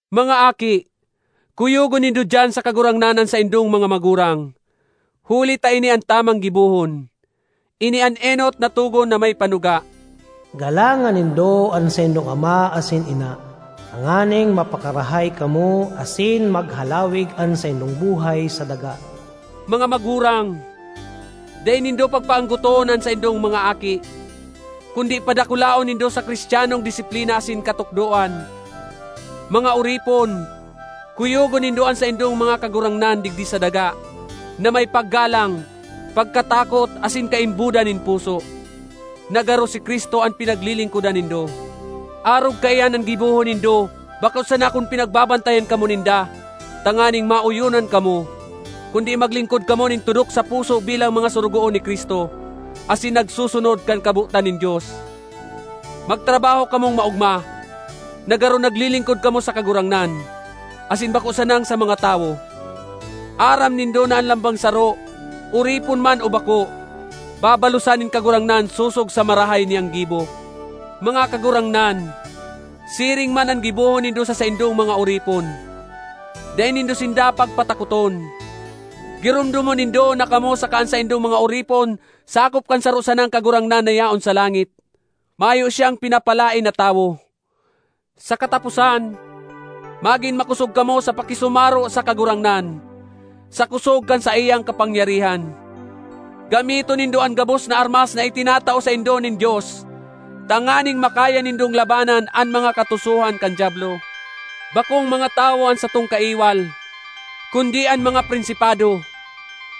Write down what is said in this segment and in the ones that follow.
Mga aki, kuyogon nindo diyan sa Kagurangnan an saindong mga magurang, huli ta ini an tamang gibohon. Ini an enot na togon na may panuga: “Galangan nindo an saindong ama asin ina, tanganing mapakarahay kamo asin maghalawig an saindong buhay sa daga.” Mga magurang, dai nindo pagpaanggoton an saindong mga aki, kundi padakulaon nindo sa Cristianong disiplina asin katukdoan. Mga oripon, kuyogon nindo an saindong mga kagurangnan digdi sa daga, na may paggalang, pagkatakot asin kaimbodan nin puso, na garo si Cristo an pinaglilingkodan nindo. Arog kaiyan an gibohon nindo bako sana kun pinagbabantayan kamo ninda tanganing maoyonan kamo, kundi maglingkod kamo nin tudok sa puso bilang mga sorogoon ni Cristo, asin nagsusunod kan kabotan nin Dios. Magtrabaho kamong maogma, na garo naglilingkod kamo sa Kagurangnan, asin bako sanang sa mga tawo. Aram nindo na an lambang saro, oripon man o bako, babalosan nin Kagurangnan sosog sa marahay niyang gibo. Mga kagurangnan, siring man an gibohon nindo sa saindong mga oripon; dai nindo sinda pagpatakoton. Giromdomon nindo na kamo saka an saindong mga oripon sakop kan saro sanang Kagurangnan na yaon sa langit. Mayo siyang pinapalaen na tawo. Sa kataposan, magin makosog kamo sa pakisumaro sa Kagurangnan, sa kosog kan saiyang kapangyarihan. Gamiton nindo an gabos na armas na itinatao saindo nin Dios, tanganing makaya nindong labanan an mga katusohan kan Diablo. Bakong mga tawo an satong kaiwal, kundi an mga prinsipado,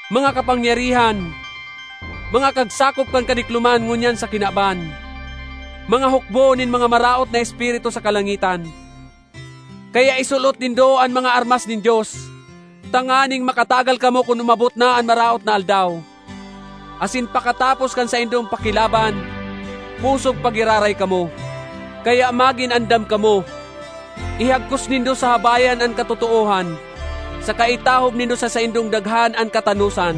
mga kapangyarihan, mga kagsakop kan kadikloman ngunyan sa kinaban, mga hukbo nin mga maraot na espiritu sa kalangitan. Kaya isulot nindo an mga armas nin Dios, tanganing makatagal kamo kun umabot na an maraot na aldaw, asin pakatapos kan saindong pakilaban, pusog pa giraray kamo. Kaya magin andam kamo! Ihagkos nindo sa habayan an katotoohan, saka itahob nindo sa saindong daghan an katanosan.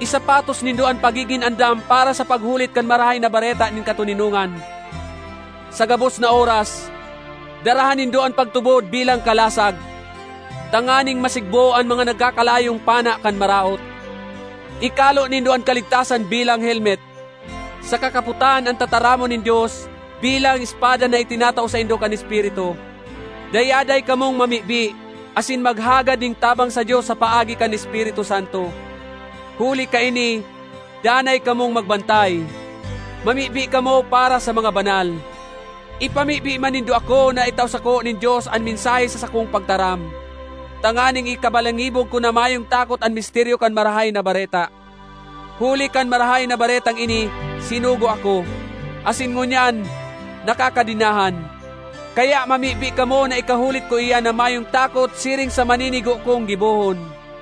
Isapatos nindo an pagigin andam para sa paghulit kan Marahay na Bareta nin katoninongan. Sa gabos na oras, daraha nindo an pagtubod bilang kalasag, tanganing masigbo an mga nagkakalayong pana kan Maraot. Ikalo nindo an kaligtasan bilang helmet, saka kapotan an tataramon nin Dios bilang espada na itinatao saindo kan Espiritu. Dayaday kamong mamibi asin maghagad nin tabang sa Dios sa paagi kan Espiritu Santo. Huli kaini danay kamong magbantay; mamibi kamo para sa mga banal. Ipamibi man nindo ako na itao sako nin Dios an mensahe sa sakong pagtaram, tanganing ikabalangibog ko na mayong takot an misteryo kan Marahay na Bareta. Huli kan Marahay na Baretang ini sinugo ako, asin ngunyan nakakadenahan. Kaya mamibi kamo na ikahulit ko iyan na mayong takot siring sa maninigo kong gibohon.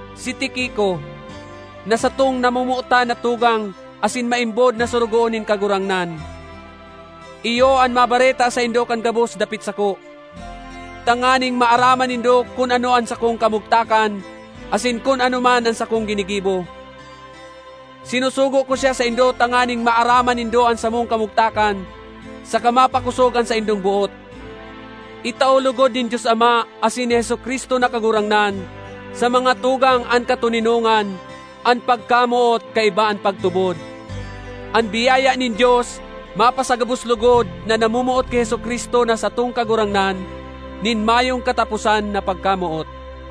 Si Tiquico, na satong namomotan na tugang asin maimbod na sorogoon nin Kagurangnan, iyo an mabareta saindo kan gabos dapit sako, tanganing maaraman nindo kun ano an sakong kamugtakan asin kun ano man an sakong ginigibo. Sinusugo ko siya saindo tanganing maaraman nindo an samong kamugtakan saka mapakosog an saindong boot. Itao logod nin Dios Ama asin ni Jesu-Cristo na Kagurangnan sa mga tugang an katoninongan, an pagkamoot kaiba an pagtubod. An biyaya nin Dios mapasagabos logod na namomoot ki Jesu-Cristo na satong Kagurangnan nin mayong kataposan na pagkamoot.